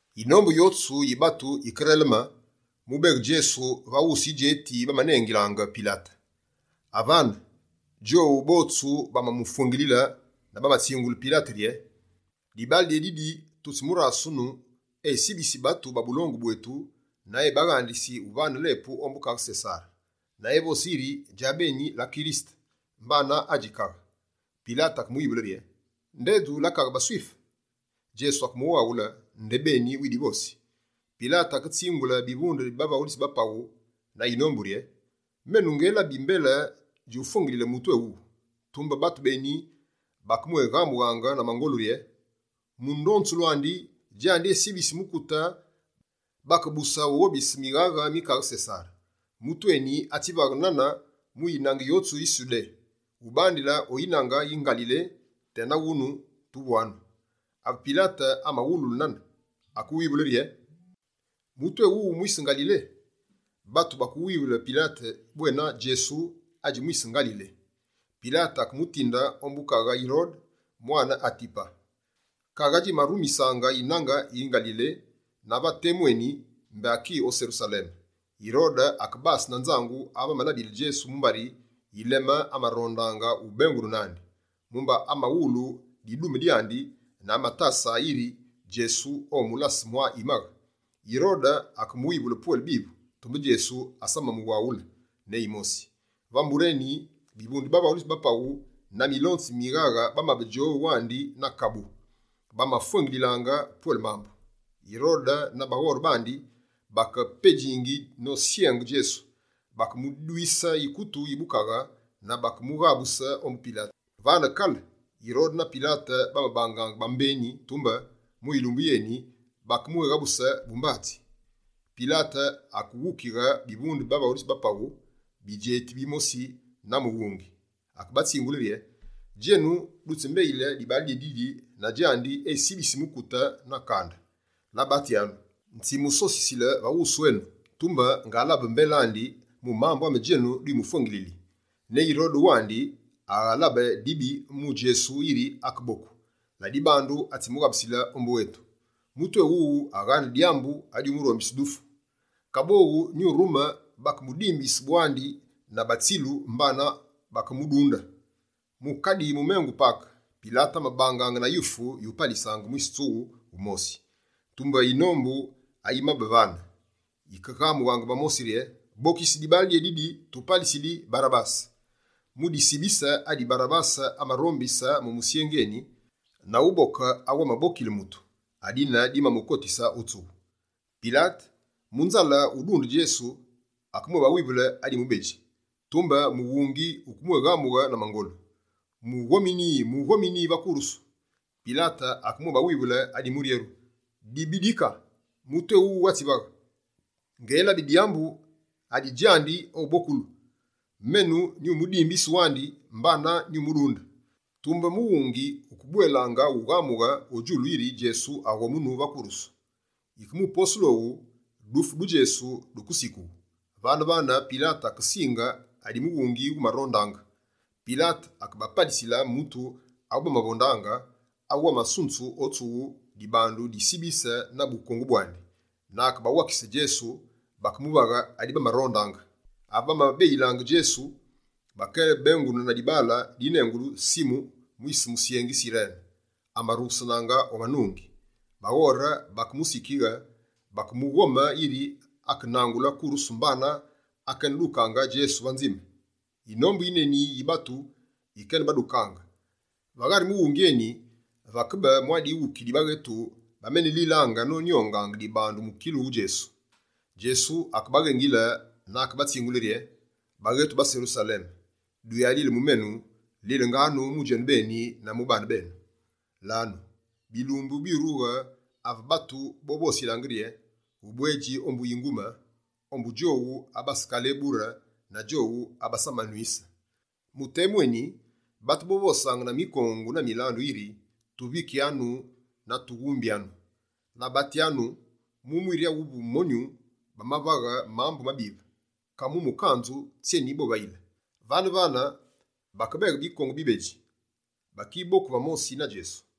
Yinombu yotsu yi batu yikereleme, mu ubeghe Djesu va wusu yidjeti bamanengilaange Pilate. Avane, djowu botsu bamamufwengile na bamatsingule Pilate rye: «Dibaale dyédidi, tutsimurasunu esibisi batu ba bulongu bwetu na ebaghandisi uvane lepu ombu Kaghe Sesare, na evosi yiri djabeni la Kirisete mbana adji Kaghe.» Pilate akemuwivule rye: «Ndedju la Kaghe baSwife?» Djesu akemuwaghule: «Ndebeni widivosi.» Pilate aketsingule bivunde bi bavaghulitsi ba paghu na yinombu rye: «Menu ngelabi mbele djufwengiyile mutu éwuwu.» Tumbe batu beni bakemwéghamungaange na mangolu rye: «Mu ndonzulu andi, djandi esibisi mukute bakebuse ughobise mighaghe mi kaghe Sesare. Mutu eni atsivaghe nane mu yinange yotsu yi Sudé, ubandile o yinange yi Ngalile, tena wunu tuvwanu.» Ave Pilate amawululu nane, akewivule rye: «Mutu éwuwu, mwise Ngalile?» Batu bakewaghule Pilate bwena Djesu adji mwise Ngalile. Pilate akemutinde ombu kaghe Yirode mwane Atipa. Kaghe adjimarumisaange yinange yi Ngalile na va temu eni, mbé aki o Serusaleme. Yirode akebase na nzangu ave amalabile Djesu mumbari yilemee amarondaange ubengune nandi. Mumba amawulu didume dyandi na amatasaange yiri Djesu omulase mwa yimaghe. Yirode akemuwivule pwele bivu, tumbe Djesu asamamuwaghule ne yimosi. Vane mbure eni, bivunde bi bavaghulitsi ba paghu na milonzi mi mighaghe bamabe djowu andi na kabu, bakemufwengiyilaange pwele mambu. Yirode na baghore bandi bakepedjingi nosyenge Djesu. Bakemudwise yikutu yi bukaghe na bakemughabuse ombu Pilate. Vane kale Yirode na Pilate bamabangaange bambeni, tumbe mu yilumbu yéyine, bakebwéghabusile bumbatsi. Pilate akeghukighe bivunde bi bavaghulitsi ba paghu, bidjeti bimosi na mughungi, akebatsingule rye: «Djenu dutsimbeyile dibaale dyédidi na djandi esibisi mukute na kande. Labatyanu, nyitsimusosisile va wusu enu, tumbe ngalabe mbele andi mu mambu ame djenu dwimufwengilili. Ne Yirode djawandi, aghalabe dibi mu Djesu yiri akeboku. Ladibandu atsimughabusile ombu etu. Mutu éwuwu aghaane dyambu adyumurombise dufu. Kaboghu nyurume bakemudimbise bwandi na batsilu mbana bakemudunde.» [ Mu kadi mumengu Pake, Pilate amabangaange na yufu yupalisaange mwise tsughu wumosi.] Tumbe yinombu ayimabe vane, wikeghamughe va mosi rye: «Bokise dibaale dyédidi, tupalisili Barabase.» Mu disibise adi Barabase amarombise mu musyengi eni, na uboke awu amabokile mutu, adine dimamukotise o tsughu. Pilate, mu nzale udunde Djesu, akemwébawivule adi mubedji. Tumbe mughungi wukebwéghamughe na mangolu: «Mughomini, mughomini va kurusu.» Pilate akemwébawivule adi muryeru rye: «Dibi dika, mutu éwuwu atsivaghe? Ngelabi dyambu adi djandi obokulu. Menu, nyumudimbise wandi mbana, nyumudunde.» Tumbe mughungi wukebwelaange ughamughe o djulu yiri Djesu aghomunu va kurusu. Yike mu posulu owu, dufu du Djesu dukesikughu. Vane-vane, Pilate akesinge adi mughungi wumarondaange. Pilate akebapalisile mutu awubamavondaange awu amasunzu o tsughu dibandu disibise na bukongu bwandi, na akebawakise Djesu bakemuvaghe adi bamarondaange. Ave bamabeyilaange Djesu, bakebengune na dibaale dinengulu Simu mwise musyengi Sirene amarughesenaange o manungi. Baghore bakemusikighe na bakemughome yiri akenangule kurusu mbana akenedukaange Djesu va nzime. Yinombu yineni yi batu yikenebadukaange. Va ghari mughungi eni vakebe mwa dighuki di baghetu bamenelilaange nonyongaange dibandu mukilu wu Djesu. Djesu akebaghengile na akebatsingule rye: «Baghetu ba Serusaleme, duyalile mu menu, lilenganu mu djenubeni na mu baane benu. Lanu, bilumbu byurughe ave batu bovosilaange rye: “Ubwedji ombu bingume, ombu djowu abasekalebure na djowu abasamanwise.” Mu temu eni, batu bovosaange na mikongu na milandu yiri: “Tuvikyanu na tughumbyanu.” Labatyanu, mu mwiri awu monyu bamavaghe mambu mabive, ka mu mukanzu, tsyeni bovayile?» Vane-vane, bakebeghe bikongu bibedji bakiboku va mosi na Djesu.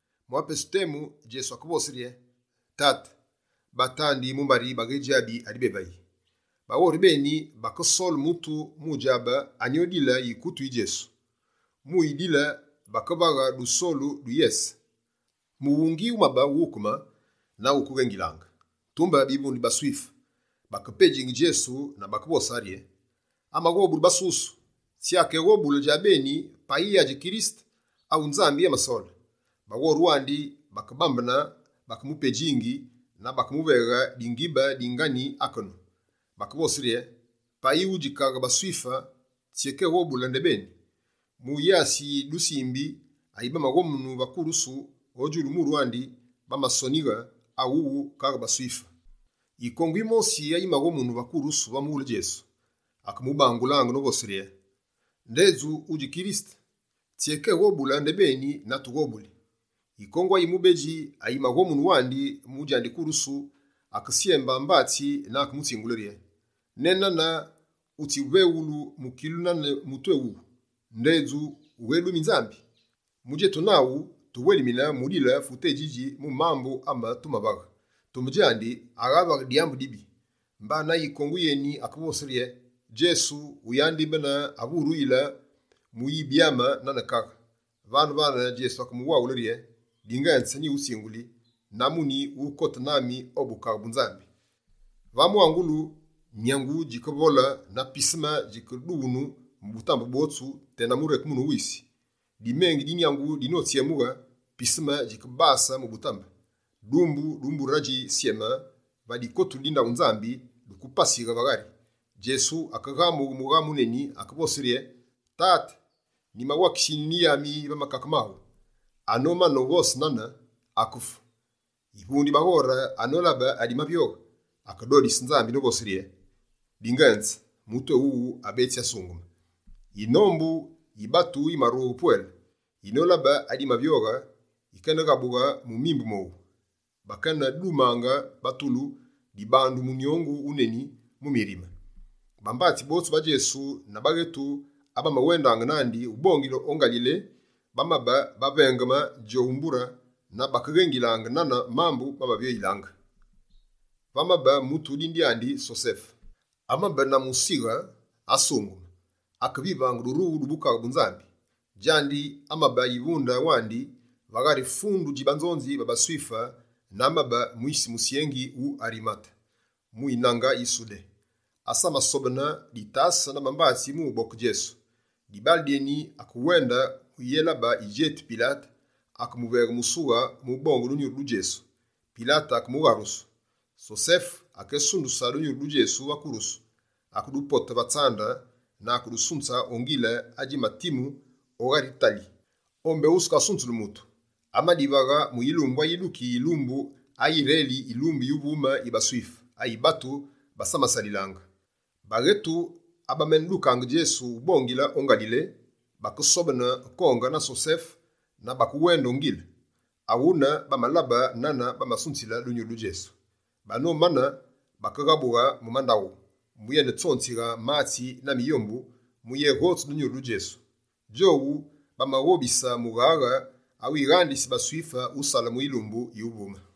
[Mwa pesu temu, Djesu akevose rye: «Tate, batandi mumbari baghedjabi adi bévayi.»] Baghore beni bakesole mutu mu udjabe anyi odile yikutu yi Djesu. Mu uyidile, bakevaghe dusolu du yese. Mughungi wumabe wughukeme na wukeghengilaange. Tumbe bivunde bi baSwife, bakepedjingi Djesu na bakevosange rye: «Amaghobule basusu, tsyé akeghobuli djabeni payi adji Kirisete awu Nzambi amasole!» Baghore wandi bakebambene, bakemupedjingi na Bakemuveghe dingibe dingani akenu. Bakevose rye: «Payi wudji Kaghe baSwife, tsyékeghobule ndebeni!» Mu yasi yi dusimbi ayimaghomunu va kurusu o djulu muru andi, bamasonighe: «Awuwu, Kaghe baSwife.» Yikongu yimosi ayimaghomunu va kurusu va mughule Djesu, akemubangulaange novose rye: «Ndedju, meta wudji Kirisete? Tsyékeghobule ndebeni na tughobuli!» Yikongu ayi mubedji ayimaghomunu wandi mu djandi kurusu, akesyembe mbatsi na akemutsingule rye: «Nenane wutsiveghulu mukilu nane mutu éwuwu, ndedju wughédumi Nzambi? Mu djetu naghu, tuwelimine mudile fute édjidji mu mambu ame tumavaghe. Tumbe djandi, aghavaghe dyambu dibi.» Mbana yikongu yeni akevose rye: «Djesu, wuyandibene ave wuruyile mu uyibyame nane kaghe.» Vane-vane, Djesu akemuwaghule rye: «Dingenze nyighutsinguli, na muni, wukote nami o Bukaghe bu Nzambi.» Va mwangulu, nyangu djikevole na pisime djikedughunu mu butambe bwotsu tena murekemunu wu wisi. Dimengi di nyangu dinotsyemughe, pisime djikebase mu butambe, dumbu du mbure adji Syeme va dikotulu di ndaghu Nzambi dukepasighe va ghari. Djesu akeghamughe mughamu wuneni, akevose rye: «Tate, nyiwakisi Yinyuni yami va makake maghu.» Anomane uvose nane, akefu. Yivunde yi baghore anolabe adimavyoghe, akedodise Nzambi novose: «Dingenze, mutu éwuwu abetsi asungeme.» Yinombu yi batu yimarughe pwele, yinolabe adimavyoghe, yikeneghabughe mu mimbu mowu, bakene dumange batulu dibandu munyongu wuneni mu mirime. Bambatsi botsu ba Djesu na baghetu abamawendaange nandi, ubongile o Ngalile, bamabe bavengeme djowu mbure na bakeghengilaange nane mambu mamavyoyilaange. Vamabe mutu dine dyandi Sosefe, amabe na musighe, asungeme, akevivaange durughulu du Bukaghe bu Nzambi. Djandi, amabe yivunde wandi va ghari fundu dji banzonzi ba baSwife na amabe mwise musyengi wu Arimate mu yinange yi Sudé. Asamasobene ditase na bambatsi mu uboke Djesu. Dibaale dyeni, akewende, mu uyélabe yidjeti Pilate, akemuveghe musughe mu ubonge dunyuru du Djesu. Pilate akemugharusu. Sosefe akesunduse dunyuru du Djesu va kurusu, akedupote va tsande na akedusunze o ngile adjimatimu o ghari tali o mbé wukatswighulu mutu. Amadivaghe, mu yilumbu ayiduki yilumbu ayireli yilumbu yuvume yi baSwife, ayi batu basamasalilaange. Baghetu abamenedukaange Djesu, ubongile o Ngalile, bakesobene konge na Sosefe na bakewende o ngile. Awune bamalabe nane bamasunzile dunyuru du Djesu. Banomane, bakeghabughe mu mandaghu, muyetsonzighe matsi na miyombu muyeghotse dunyuru du Djesu. Djowu, bamaghobise mughaghe awighandisi baSwife usale mu yilumbu yuvume.